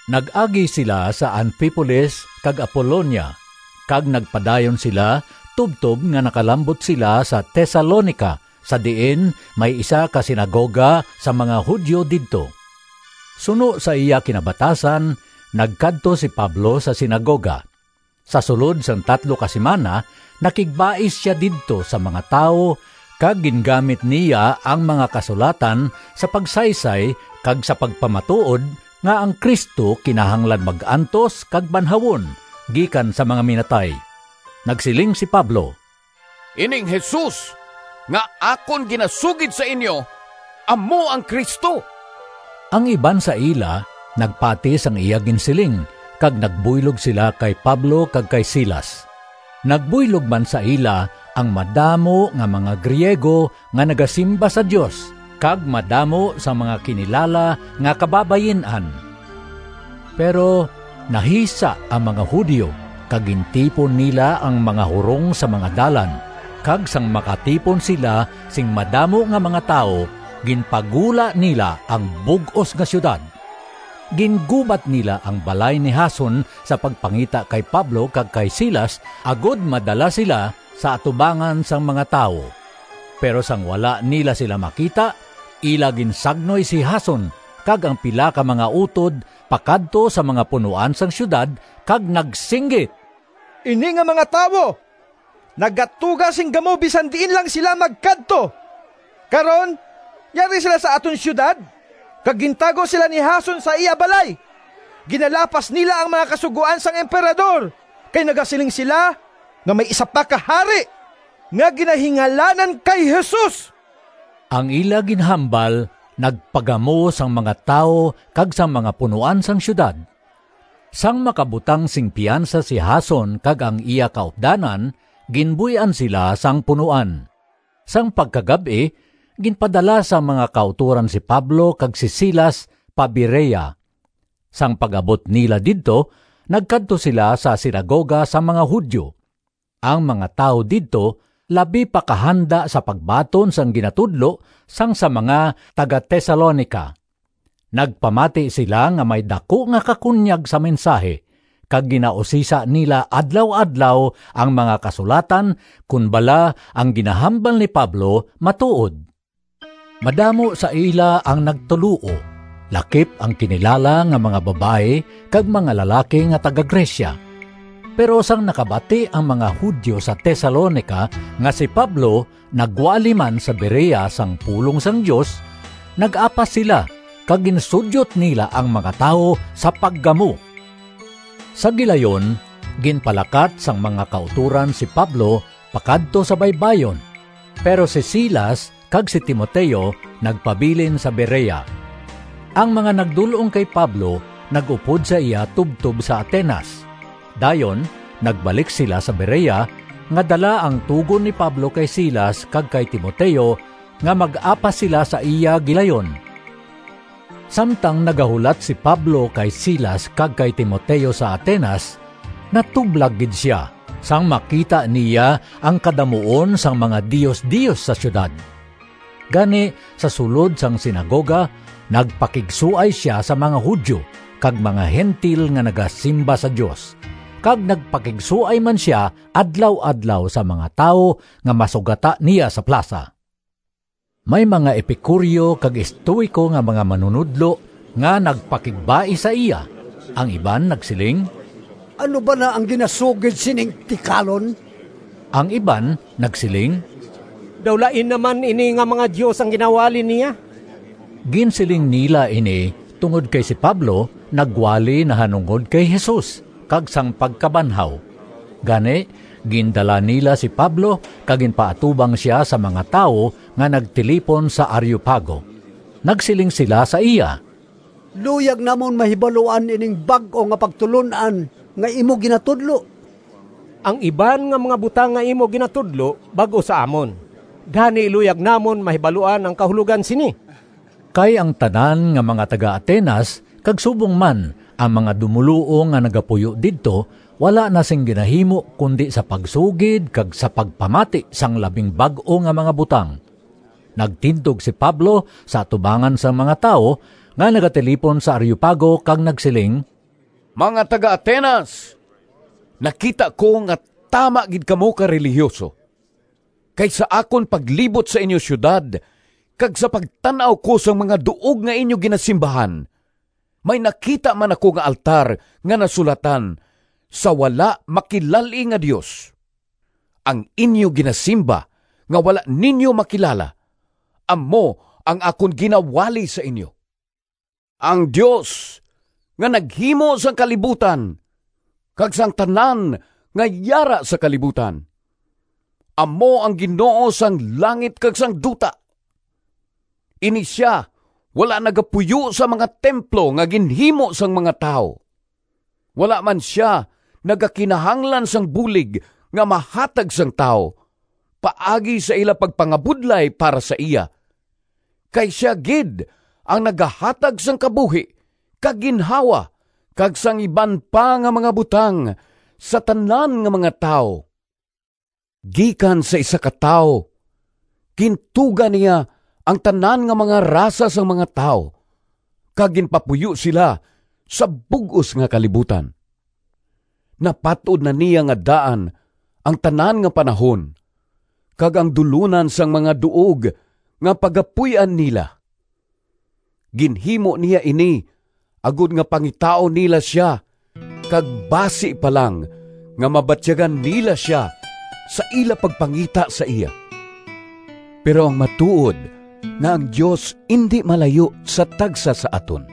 Nag-agi sila sa Anfipolis kag Apolonia kag nagpadayon sila tubtob nga nakalambot sila sa Tesalonica sa diin may isa ka sinagoga sang mga Judio didto. Suno sa iya kinabatasan nagkadto si Pablo sa sinagoga. Sa sulod sang tatlo ka simana nakigbais sia didto sa mga tawo kag gingamit niya ang mga Kasulatan sa pagsaysay kag sa pagpamatuod nga ang Cristo kinahanglan mag-antos kag banhawon gikan sa mga minatay. Nagsiling si Pablo, “Ining Jesus nga akon ginasugid sa inyo amo ang Cristo.” Ang iban sa ila nagpati sang iya ginsiling kag nagbuylog sila kay Pablo kag kay Silas. Nagbuylog man sa ila ang madamo nga mga Griego nga nagasimba sa Dios kag madamo sang mga kinilala nga kababayin-an. Pero nahisa ang mga Judio kag gintipon nila ang mga hurong sa mga dalan kag sang makatipon sila sing madamo nga mga tawo ginpagula nila ang bug-os nga siyudad. Gingubat nila ang balay ni Jason sa pagpangita kay Pablo kag kay Silas agod madala sila sa atubangan sang mga tawo. Pero sang wala nila sila makita, ila ginsagnoy si Jason kag ang pila ka mga utod pakadto sa mga punoan sang siyudad kag nagsinggit, “Ini nga mga tawo nagatuga sing gamo bisan diin lang sila magkadto! Karon yari sila sa aton siyudad kag gintago sila ni Jason sa iya balay. Ginalapas nila ang mga kasugoan sang Emperador kay nagasiling sila nga may isa pa ka hari nga ginahingalanan kay Jesus.” Ang ila ginhambal nagpagamo sang mga tawo kag sang mga punoan sang siyudad. Sang makabutang sing piyansa si Jason kag ang iya kaupdanan ginbuy-an sila sang punoan. Sang pagkagab-i ginpadala sang mga kautoran si Pablo kag si Silas pa Berea. Sang pag-abot nila didto, nagkadto sila sa sinagoga sang mga Judio. Ang mga tawo didto labi pa ka handa sa pagbaton sang ginatudlo sang sa mga taga-Tesalonica. Nagpamati sila nga may daku nga kakunyag sa mensahi kag ginausisa nila adlaw-adlaw ang mga Kasulatan kon bala ang ginahambal ni Pablo matuod. Madamo sa ila ang nagtuloo lakip ang kinilala nga mga babayi kag mga lalaki nga taga-Grecia. Pero sang nakabati ang mga Judio sa Tesalonica nga si Pablo nagwali man sa Berea sang pulong sang Dios, nag-apas sila kag ginsudyot nila ang mga tawo sa paggamo. Sa gilayon ginpalakat sang mga kautoran si Pablo pakadto sa baybayon, pero si Silas kag si Timoteo nagpabilin sa Berea. Ang mga nagdul-ong kay Pablo nag-upod sa iya tubtob sa Atenas. Dayon nagbalik sila sa Berea nga dala ang tugon ni Pablo kay Silas kag kay Timoteo nga mag-apas sila sa iya gilayon. Samtang nagahulat si Pablo kay Silas kag kay Timoteo sa Atenas, natublag gid sia sang makita niya ang kadamuon sang mga diosdios sa siyudad. Gani sa sulod sang sinagoga nagpakigsuay sia sa mga Judio kag mga Gentil nga nagasimba sa Dios, kag nagpakigsuay man sia adlaw-adlaw sa mga tawo nga masugata niya sa plasa. May mga Epicureo kag Estoico nga mga manunodlo nga nagpakigbais sa iya. Ang iban nagsiling, “Ano bala ang ginasugid sining tikalon?” Ang iban nagsiling, “Daw lain na man ini nga mga dios ang ginawali niya.” Ginsiling nila ini tungod kay si Pablo nagwali nahanungod kay Jesus kag sang pagkabanhaw. Gani gindala nila si Pablo kag ginpaatubang sia sa mga tawo nga nagtilipon sa Areopago. Nagsiling sila sa iya, “Luyag namon mahibaluan ining bag-o nga pagtulon-an nga imo ginatudlo. Ang iban nga mga butang nga imo ginatudlo bag-o sa amon, gani luyag namon mahibaluan ang kahulogan sini.” (Kay ang tanan nga mga taga-Atenas kag subong man ang mga dumoluong nga nagapuyo didto wala na sing ginahimo kundi sa pagsugid kag sa pagpamati sang labing bag-o nga mga butang.) Nagtindog si Pablo sa atubangan sang mga tawo nga nagatilipon sa Areopago kag nagsiling, “Mga taga-Atenas! Nakita ko nga tama gid kamo ka relihiyuso. Kay sa akon paglibot sa inyo siyudad kag sa pagtan-aw ko sang mga duog nga inyo ginasimbahan, may nakita man ako nga altar nga nasulatan, ‘Sa Wala Makilal-i nga Dios.’ Ang inyo ginasimba nga wala ninyo makilala, amo ang akon ginawali sa inyo. Ang Dios nga naghimo sang kalibutan kag sang tanan nga yara sa kalibutan, amo ang Ginoo sang langit kag sang duta. Ini sia wala nagapuyo sa mga templo nga ginhimo sang mga tawo. Wala man sia nagakinahanglan sang bulig nga mahatag sang tawo paagi sa ila pagpangabudlay para sa iya, kay sia gid ang nagahatag sang kabuhi kag ginhawa kag sang iban pa nga mga butang sa tanan nga mga tawo. Gikan sa isa ka tawo gintuga niya ang tanan nga mga rasa sang mga tawo kag ginpapuyo sila sa bug-os nga kalibutan. Napat-od na niya nga daan ang tanan nga panahon kag ang dulonan sang mga duog nga pagapuy-an nila. Ginhimo niya ini agod nga pangitaon nila sia kag basi pa lang nga mabatyagan nila sia sa ila pagpangita sa iya. Pero ang matuod nga ang Dios indi malayo sa tagsa sa aton,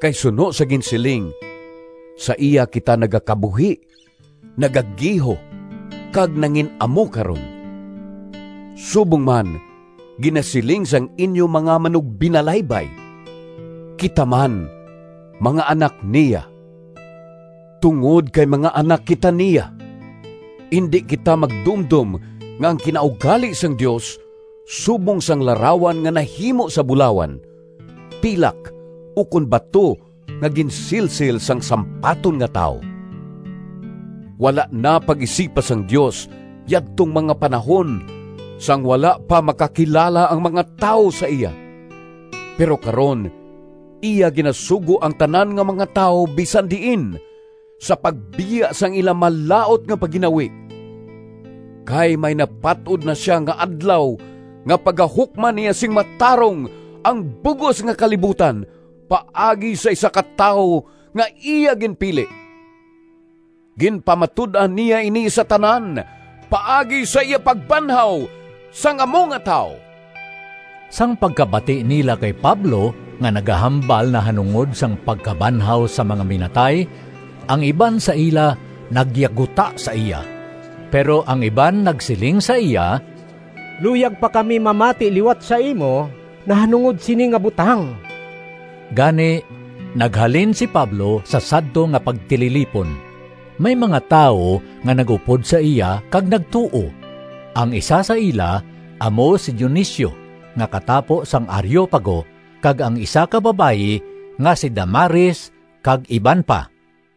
kay suno sa ginsiling, ‘Sa iya kita nagakabuhi, Nagagiho kag nangin-amo karon.’ Subong man ginasiling sang inyo mga manugbinalaybay, ‘Kita man mga anak niya.’ Tungod kay mga anak kita niya, indi kita magdumdom nga ang kinaugali sang Dios subong sang larawan nga nahimo sa bulawan, pilak ukon bato nga ginsilsil sang sampaton nga tawo. Wala na pag-isipa sang Dios yadtong mga panahon sang wala pa makakilala ang mga tawo sa iya, pero karon iya ginasugo ang tanan nga mga tawo bisan diin sa pagbiya sang ila malaut nga pagginawi. Kay may napat-od na sia nga adlaw nga pagahukman niya sing matarong ang bug-os nga kalibutan paagi sa isa ka tawo nga iya ginpili. Ginpamatud-an niya ini sa tanan paagi sa iya pagbanhaw sang amo nga tawo!” Sang pagkabati nila kay Pablo nga nagahambal nahanungod sang pagkabanhaw sa mga minatay, ang iban sa ila nagyaguta sa iya, pero ang iban nagsiling sa iya, “Luyag pa kami mamati liwat sa imo nahanungod sini nga butang.” Gani naghalin si Pablo sa sadto nga pagtililipon. May mga tawo nga nag-upod sa iya kag nagtuo; ang isa sa ila amo si Dionisio nga katapo sang Areopago kag ang isa ka babayi nga si Damaris kag iban pa.